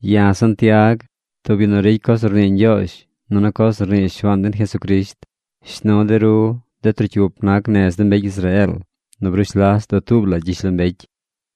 Ya̱ Santiag, tub yu nu ricy coz nu rnii Ñgyoozh nunu coz nu rnii Shuaan den Jesucrisht. Shnu̱ de ru, de trocyup nac nez de mbecy Israeel nu brush las dutuub la gyishlombecy.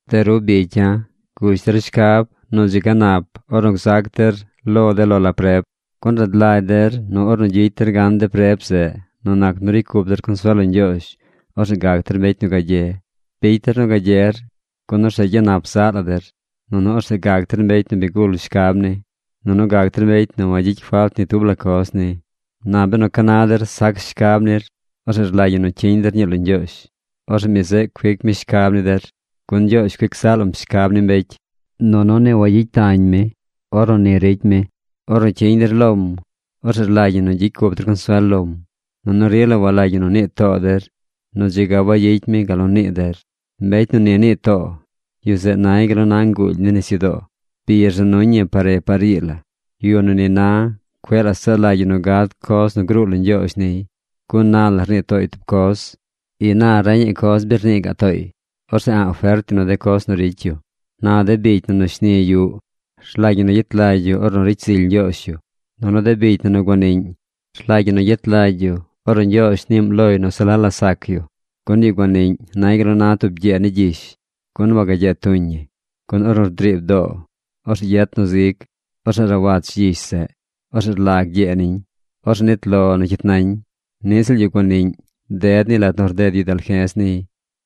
De ru bicya̱, gush der shcab nu dzi ga nap ornu gzac der lo de lo la preb, gun rad lagy der nu ornu gyicy der gan de preb zeꞌ nu nac nu ricy cup der consuel lo Ñgyoozh, orzeꞌ gac der mbecy nu gagye. Bicy der nu gagyer, gun orzeꞌ gyanap zaꞌ la der. Nunu orzeꞌ gac der mbecy nu bi gul shcab ni, nunu gac der mbecy nu wagyicy falt ni tub la coz ni. Na benu ca na der sac shcab nir, orzeꞌ rlagy ñi nu cyiñ der ñii lo Ñgyoozh. Orzeꞌ mi zeꞌ cuic mi shcab ni der, gun Ñgyoozh cuic zaꞌ lam shcab ni mbecy, nunu ni wayicy tañ mi ornu ni cuic mi. Ornu cyiñ der lom, orzeꞌ rlagy ñi nu gyicy cup der consuel lom, nunu rila walagy ñi nu nii too der nu dzi ga wayicy mi gal nu nii der. Mbecy nu ni nii too, yu zeꞌ nay gal nu na nguuly ni nisyudoo. Bi rza nuñ ñi par re par ii la. Yu nu ni na, cueꞌ la saꞌ lagy yu nu gad coz nu gruu lo Ñgyoozh niy. Gun na la rnii tooy tub coz. Ina reñaꞌ coz bi rnii gaꞌ tooy. Orzeꞌ a̱ꞌ fert yu nu de coz nu ricy yu. Na de bicy na nu shni yuꞌ, rlagy ñi nu gyet lagy yu ornu ricy zily Ñgyoozh yu. Nunu de bicy na nu guaniꞌñ, rlagy ñi nu gyet lagy yu ornu Ñgyoozh niim loy nu se la la sac yu. Gun yu guaniꞌñ nay gal nu na tub gyee ni gyish, gun wagagyee tuñ ñi. Gun ornu driib doo, orzeꞌ yet nu zig, orzeꞌ rawach gyish zeꞌ. Orzeꞌ rlag gyee niñ. Orzeꞌ nit lo nu cyit nañ. Niꞌ ziꞌl yu guaniꞌñ ded niy lat nu rded yu dalje̱z niy.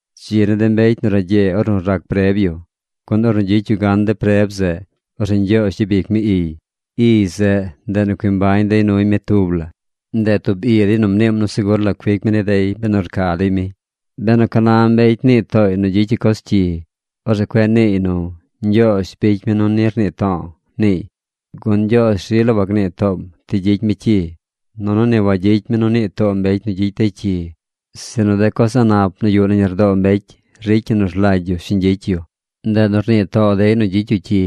Dzi ni de mbecy nu ragyee ornu rac preb yu, gun ornu gyicy yu gan de preb zeꞌ, orzeꞌ Ñgyoozh gyabic mi iy. Iy zeꞌ, ndeꞌ nu cui mbañ dey nuy mi tub la. Ndeꞌ tub i dey nu mniim nu segur la cuic mi ni dey benu rca dey mi. Benu ca na mbecy nii tooy nu gyicy yu coz cyi, orzeꞌ cueꞌ niiy nu: “Ñgyoozh bicy mi nu ni rnii to̱o̱”, niiy. Gun Ñgyoozh rila wagnii toom ti gyicy mi cyi. Nunu ni wagyicy mi nu nii too mbecy nu gyicy dey cyi. Sinu de coz a̱ꞌ nap nu yuꞌ nañ lardoo mbecy ricy ñi nu rlagy yu shiñ gyicy yu. Ndeꞌ nu rnii too dey nu gyicy yu cyi.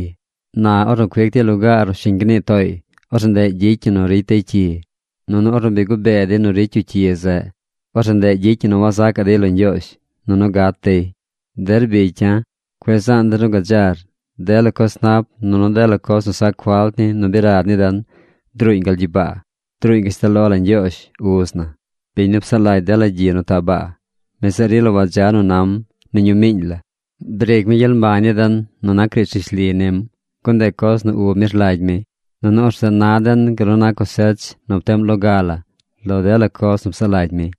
Na ornu cuic dey lugaar nu shiñ gnii tooy, orzeꞌ ndeꞌ gyicy ñi nu ricy dey cyi. Nunu ornu bi gubee dey nu ricy yu cyi zeꞌ, orzeꞌ ndeꞌ gyicy ñi nu wazacaꞌ dey lo Ñgyoozh, nunu gat dey. Der bicy ya̱, cueꞌ zaan der nu gadzar. Dela coz nap nunu dela coz nu sac falt ni nu bi rad ni den, druuñ gal gyibaa. Druuñ gashtal lo la Ñgyoozh, Uz na, biñ nu psaꞌ lagy dela gyi nu taꞌ baa. Mi zeꞌ rila wadza nu nam ni ñu miiñ la. Briic mi gyel mbañ ni den nu nac riidz rishli nim, gun ndeꞌ coz nu ub mi rlagy mi. Nunu orzeꞌ na den gal nu na cosech nu pteꞌm loga la lo dela coz nu psaꞌ lagy mi.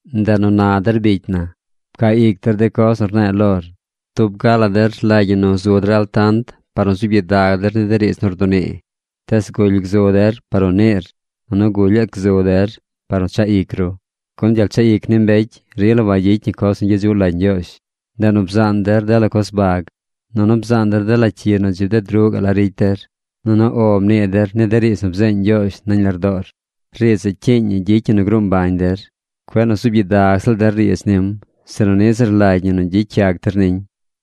Ndeꞌ nu na der bicy na, pcaa ic der de coz nu rne̱e̱ lor. Tub ga la der rlagy ñi nu zu der altant par nu zuub gyidag der ni de riidz nu rdunii. Tees guly gzu der par nu niir, nunu gulyaꞌ gzu der par nu chaꞌ ic ru. Gun gyel chaꞌ ic ni mbecy rila wayicy ñi coz nu gyedzuꞌ lagy Ñgyoozh. Ndeꞌ nu bzaan der dela coz bag, nunu bzaan der dela cyi nu dzi bded ruꞌ gaꞌ la ricy der. Nunu “O” mnii der ni de riidz nu bzeeñ Ñgyoozh nañ lardoor. Riidz zeꞌ cyiiñ ñi gyicy ñi nu gruu mbañ der. Cueꞌ nu zuub gyidag ziꞌl der riidz nim, sinu niꞌ ziꞌl rlagy ñi nu gyicy yac der niñ.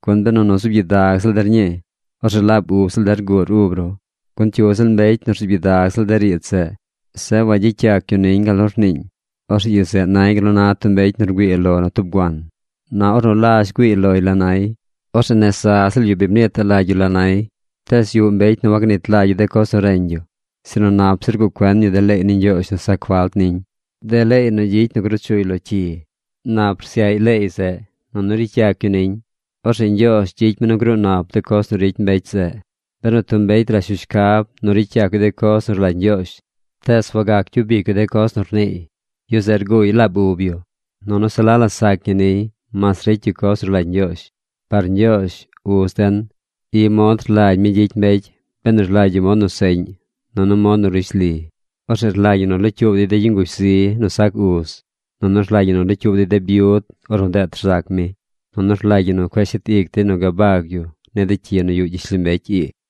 Gun benu nu zuub gyidag ziꞌl der ñii, orzeꞌ laab ub ziꞌl der rguur ub ru. Gun cyu ziꞌl mbecy nu rzuub gyidag ziꞌl de riidz zeꞌ, zeꞌ wagyicy yac yu niñ gal nu rniiñ, orzeꞌ yu zeꞌ nay gal nu na tub mbecy nu rgüii lo nu tub guan. Na ornu lazh güiiy loy la nay, orzeꞌ nez za ziꞌl yu bi mniitaꞌ lagy yu la nay. Tees yuꞌ mbecy nu wagnit lagy yu de coz nu reñ yu. Sinu nap zir rguꞌ cuen yu de leey ni Ñgyoozh nu sac falt niñ, de leey nu gyicy nu gruu chuy lo cyi. Nap rsyaꞌy leey zeꞌ, nunu ricy yac yu niñ. Orzeꞌ Ñgyoozh gyicy mi nu gruu nap de coz nu ricy mbecy zeꞌ. Benu tub mbecy rash yu shcab nu ricy yac yu de coz nu rlagy Ñgyoozh, tees wagac gyub ic yu de coz nu rniiy, yu zeꞌ rguuy laab ub yu. Nunu se la la sac ñi niy mas ricy yu coz nu rlagy Ñgyoozh. Par Ñgyoozh, Uz den, i mod rlagy mi gyicy mbecy benu rlagy yu mod nu seꞌñ nunu mod nu rishli: orzeꞌ rlagy ñi nu locyuub dey de yu nguzh zi nu sac uz. Nunu rlagy ñi nu locyuub dey de byud ornu deet rzac mi. Nunu rlagy ñi nu cueꞌ shet ic dey nu gabag yu ni de cyi nu yuꞌ gyishlombecy ii.